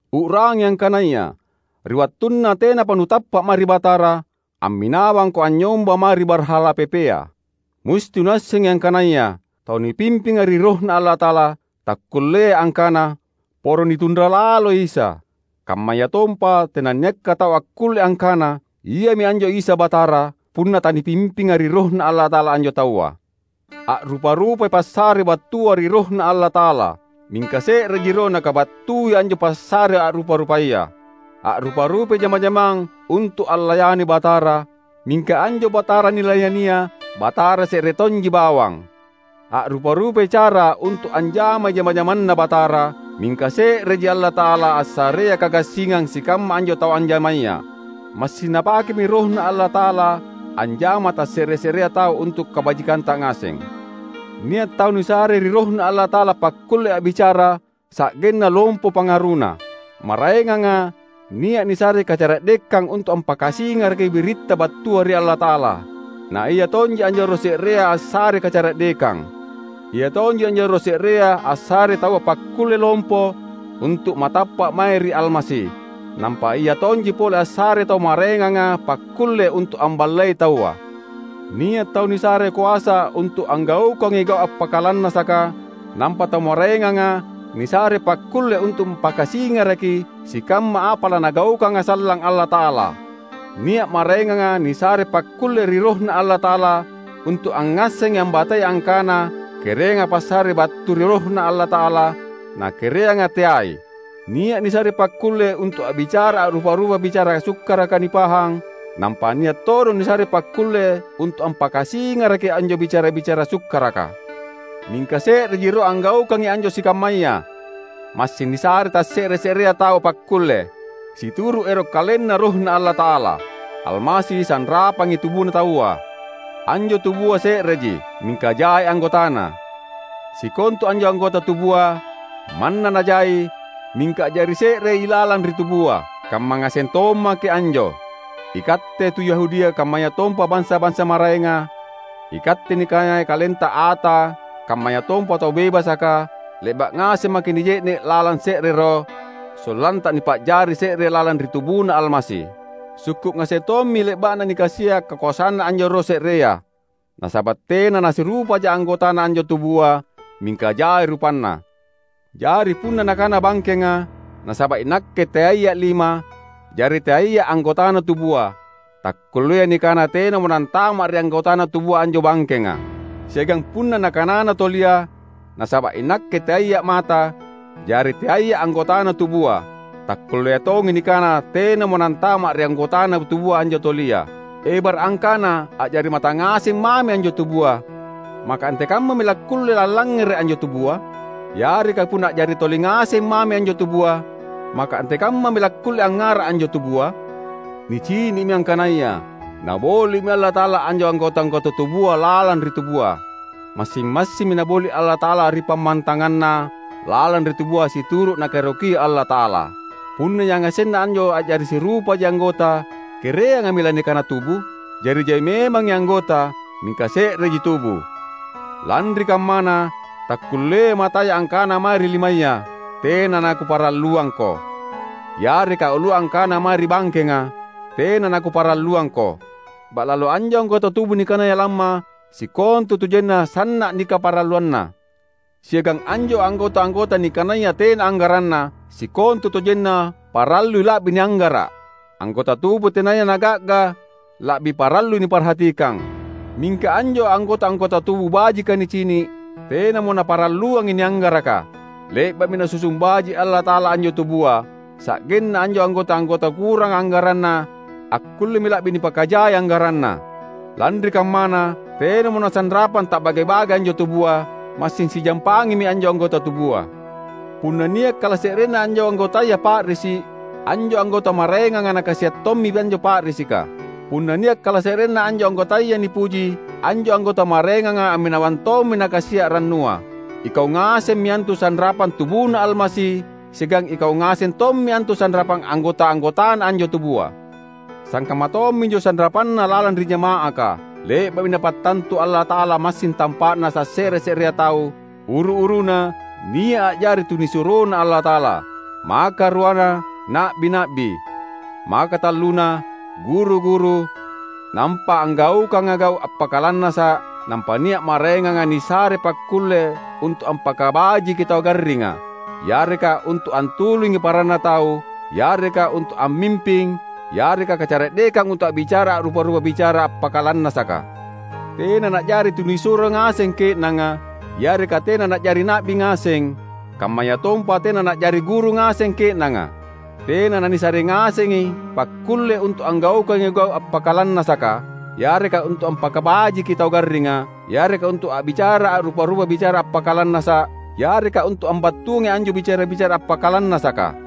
U’rangi angkanaya ri wattunna tenapa nutappa’ mae ri Batara, amminawangko anynyomba mae ri barhala pepea. Musti nuassengi angkanaya tau nipimpinga ri RohNa Allata’ala takkulleai angkana, "Poro nitunra laloi Isa!" Kammayatompa tenanniakka tau akkulle angkana, "Iami anjo Isa Batara!" punna tanipimpinga ri RohNa Allata’ala anjo taua. A’rupa-rupai passare battua ri RohNa Allata’ala, mingka se’reji Roh nakabattui anjo passare a’rupa-rupaya. A’rupa-rupai jama-jamang untu’ allayani Batara, mingka anjo Batara nilayania, Batara se’re tonji bawang! A’rupa-rupai cara untu’ anjamai jama-jamanNa Batara, mingka se’reji Allata’ala assareai kagassingang sikamma anjo tau anjamaya. Massing Napakemi RohNa Allata’ala anjama tasse’re-se’rea tau untu’ kabajikanta ngaseng. Nia’ tau nisare ri RohNa Allata’ala pakkulle a’bicara sa’genna lompo pangaruna. Maraenganga nia’ nisare kacara’dekang untu’ ampakasingaraki biritta battua ri Allata’ala; naia tonji anjo Roh se’rea assarei kacara’dekang. Ia tonji anjo Roh se’rea assarei taua pakkulle lompo untu’ matappa’ mae ri Almasi, nampa Ia tonji pole assarei tau maraenganga pakkulle untu’ amballei taua. Nia’ tau nisare koasa untu’ anggaukangi gau’ appakalannasaka, nampa tau maraenganga nisare pakkulle untu’ ampakasingaraki sikamma apa laNagaukanga sallang Allata’ala. Nia’ maraenganga nisare pakkulle ri RohNa Allata’ala untu’ angngasseng ambatei angkana kereanga passare battu ri RohNa Allata’ala, na kereanga teai. Nia’ nisare pakkulle untu’ a’bicara a’rupa-rupa bicara sukkaraka nipahang; nampa nia’ todong nisare pakkulle untu’ ampakasingaraki anjo bicara-bicara sukkaraka. Mingka se’reji Roh anggaukangi anjo sikammaya; massing nisarei tasse’re-se’rea tau pakkulle, situru’ ero’ KalenNa RohNa Allata’ala. Almasi sanrapang tubuna taua; anjo tubua se’reji, mingka jai anggotana. Sikontu anjo anggota tubua, manna najai, mingka a’jari se’rei ilalang ri tubua. Kamma ngaseng tommaki’ anjo; ikatte tu Yahudia kammayatompa bansa-bansa maraenga, ikatte nikanaya kalenta ata kammayatompa tau bebasaka, le’ba’ ngaseng maki’ nije’ne’ lalang se’re Roh, sollanta nipa’jari se’re lalang ri tubuNa Almasi. Sukku’ ngaseng tommi le’ba’na nikasia’ kakoasanNa anjo Roh se’rea. Nasaba’ tena nasirupaja anggotana anjo tubua, mingka jai rupanna. Jari punna nakana bangkenga, "Nasaba’ inakke teaiya’ lima, jari teaiya’ anggotana tubua," takkulleai nikana tenamo nantama ri anggotana tubua anjo bangkenga. Siagang punna nakanana tolia, "Nasaba’ inakke teaiya’ mata, jari teaiya’ anggotana tubua," takkullea tongi nikana tenamo nantama’ ri anggotana tubua anjo tolia. Ebara’ angkana a’jari mata ngaseng mami anjo tubua, maka antekammami lakkulle allangngere’ anjo tubua? Yareka punna a’jari toli ngaseng mami anjo tubua, maka antekammami lakkulle angngara’ anjo tubua? Nicini’mi angkanaya Naboli’mi Allata’ala anjo anggota-anggota tubua lalang ri tubua. Massing-massimmi Naboli’ Allata’ala ri pammantanganna lalang ri tubua situru’ Nakaerokia Allata’ala. Punna yangasenna anjo a’jari sirupaji anggota, kereangami lanikana tubu? Jari jai memangi anggota, mingka se’reji tubu. Lanri kammana, takkulleai mataya angkana mae ri limaya, "Tena nakuparalluangko!" Yareka ulua angkana mae ri bangkenga, "Tena nakuparalluangko!" Ba’lalo anjo anggota tubu nikanaya lamma, sikontutojenna sanna’ nikaparalluanna; siagang anjo anggota-anggota nikanaya tena anggaranna, sikontutojenna parallui la’bi nianggara’. Anggota tubu tenaya naga’ga la’bi parallui niparhatikang. Mingka anjo anggota-anggota tubu bajika nicini’, tenamo naparalluangi nianggaraka. Le’ba’mi Nasusung baji’ Allata’ala anjo tubua, sa’genna anjo anggota-anggota kuranga anggaranna akkullemi la’bi nipakajai anggaranna. Lanri kammana, tenamo nasanrapang ta’bage-bage anjo tubua; massing sijampangimi anjo anggota tubua. Punna nia’ kalase’renna anjo anggotaya pa’risi’, anjo anggota maraenganga nakasia’ tommi anjo pa’risika; punna nia’ kalase’renna anjo anggotaya nipuji, anjo anggota maraenganga amminawang tommi nakasia’ rannua. Ikau ngasemmi antu sanrapang tubuNa Almasi siagang ikau ngaseng tommi antu sanrapang anggota-anggotana anjo tubua. Sangkamma tomminjo sanrapanna lalang ri jama’aka; le’ba’mi Napattantu Allata’ala massing tampa’na tasse’re-se’rea tau: uru-uruna nia’ a’jari tunisuroNa Allata’ala, makaruana na’bi-na’bi, makatalluna guru-guru, nampa anggaukanga gau’ appakalannasa’ nampa nia’ maraenganga nisare pakkulle untu’ ampakabajiki tau garringa, yareka untu’ antulungi paranna tau, yareka untu’ ammimping, yareka kacara’dekang untu’ a’bicara a’rupa-rupa bicara appakalannasaka. Tena na’jari tunisuro ngaseng ke’nanga; yareka tena na’jari na’bi ngaseng; kammayatompa tena na’jari guru ngaseng ke’nanga. Tena nanisare ngasengi pakkulle untu’ anggaukangi gau’ appakalannasaka, yareka untu’ ampakabajiki tau garringa, yareka untu’ a’bicara a’rupa-rupa bicara appakalannasa’, yareka untu’ ambattuangi anjo bicara-bicara appakalannasaka.